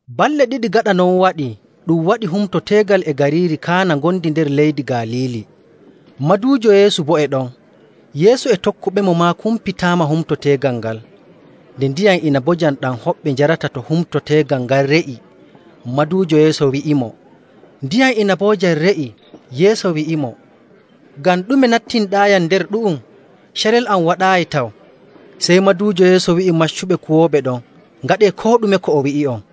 Balɗe ɗiɗi gaɗa non waɗii ɗum waɗi humto teegal e gariiri Kaana ngondi nder leydi Galiili. Maduujo Yeesu boo e ɗon. Yeesu e tokkuɓemo maa kumpitaama humto teegal ngal. Nde ndiyam inabojam ɗam hoɓɓe njarata to humto teegal ngal re'i, maduujo Yeesu wi'imo, “Ndiyam inabojam re'i.” Yeesu wi'imo, “Ngam ɗume nattinɗaayam nder ɗu'um? Carel am waɗaayi taw.” Sey maduujo Yeesu wi'i maccuɓe kuwooɓe ɗon, “Ngaɗee koo ɗume ko o wi'i'on.”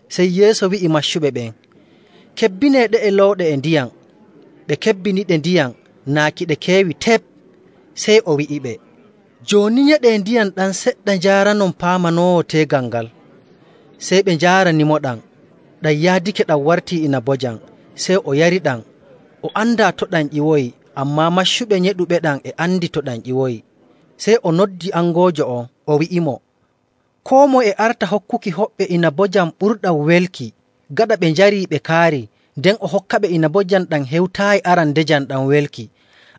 Sey Yeesu wi'i maccuɓe ɓen, “Kebbinee ɗe'e looɗe e ndiyam.” Ɓe kebbiniɗe ndiyam naa ki ɗe keewi tep. Sey o wi'iɓe, “Jooni nyeɗee ndiyam ɗam seɗɗa njaaranon paamanoowo teegal ngal.” Sey ɓe njaaranimoɗam. Ɗam yaadake ɗam wartii inabojam, sey o yariɗam. O andaa to ɗam ƴiwoyi, ammaa maccuɓe nyeɗuɓeɗam e andi to ɗam ƴiwoyi. Sey o noddi angoojo on, o wi'imo, “Koo moye e arta hokkuki hoɓɓe inabojam ɓurɗam welki, gaɗa ɓe njarii ɓe kaarii, nden o hokkaɓe inabojam ɗam hewtaayi arandejam ɗam welki.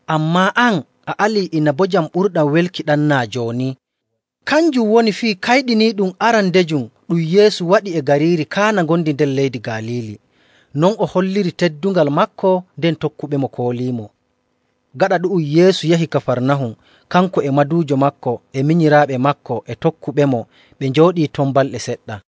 Ammaa an, a ali inabojam ɓurɗam welki ɗam naa jooni.” Kanjum woni fii kayɗiniiɗum arandejum ɗum Yeesu waɗi e gariiri Kaana ngondi leydi Galiili. Non o holliri teddungal maako, nden tokkuɓemo kooliimo. Gaɗa ɗu'um, Yeesu yahi Kafarnahum, kanko e maduujo maako, e minyiraaɓe maako, e tokkuɓemo, ɓe njooɗii ton balɗe seɗɗa..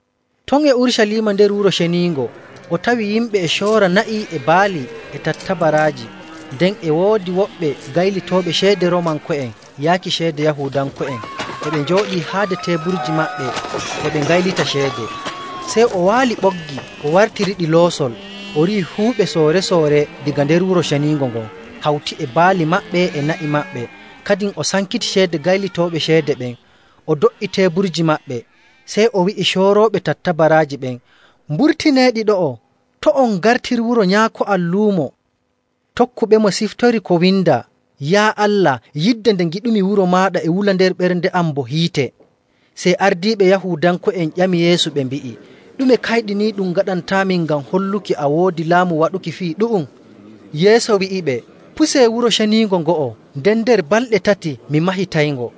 Ton e Urucaliima nder Wuro Ceniingo o tawi yimɓe e coora na'i, e baali, e tattabaraaji. Nden e woodi woɓɓe gaylitooɓe ceede Roomanko'en yaaki ceede Yahuudanko'en, e ɓe njooɗii haade teeburji maɓɓe e ɓe ngaylita ceede. Sey o waali ɓoggi o wartiriɗi loosol, o riiwi fuu ɓe soore‑soore daga nder Wuro Ceniingo ngon hawti e baali maɓɓe e na'i maɓɓe. Kadin o sankiti ceede gaylitooɓe ceede ɓen, o do''i teeburji maɓɓe. Sey o wi'i coorooɓe tattabaraaji ɓen, “Mburtineeɗi ɗo'o! To' on ngartir wuro Nyaako am luumo.” Tokkuɓemo ciftori ko windaa, “Yaa Allah, yidde nde ngiɗumi wuro maaɗa e wula nder am bo hiite.”. Sey ardiiɓe Yahuudanko'en ƴami Yeesu ɓe mbi'i, “Ɗume kayɗiniiɗum ngaɗantaamin ngam holluki a woodi laamu waɗuki fii ɗu'um?” Yeesu wi'iɓe, “Pusee Wuro Ceniingo ngo'o, nden nder balɗe tati mi mahitayngo.”.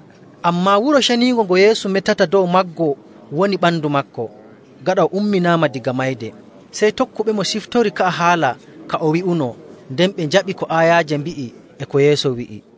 Ammaa wuro ceniingo ngo Yeesu metata dow maggo woni ɓandu maako. Gaɗa o umminaama daga mayde, sey tokkuɓemo ciftori ka'a haala ka o wi'uno, nden ɓe njaɓi ko aayaaje mbi'i e ko Yeesu wi'i.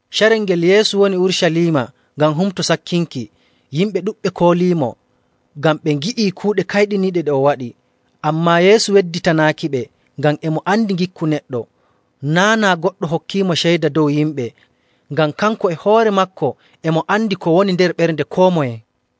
Carel ngel Yeesu woni Urucaliima ngam Humto Sakkinki, yimɓe ɗuɗɓe kooliimo ngam ɓe ngi'ii kuuɗe kayɗiniiɗe ɗe o waɗi. Ammaa Yeesu wedditanaakiɓe, ngam e mo andi ngikku neɗɗo. Naa' naa goɗɗo hokkiimo ceyda dow yimɓe, ngam kanko e hoore maako e mo andi ko woni nder ɓernde koo moye.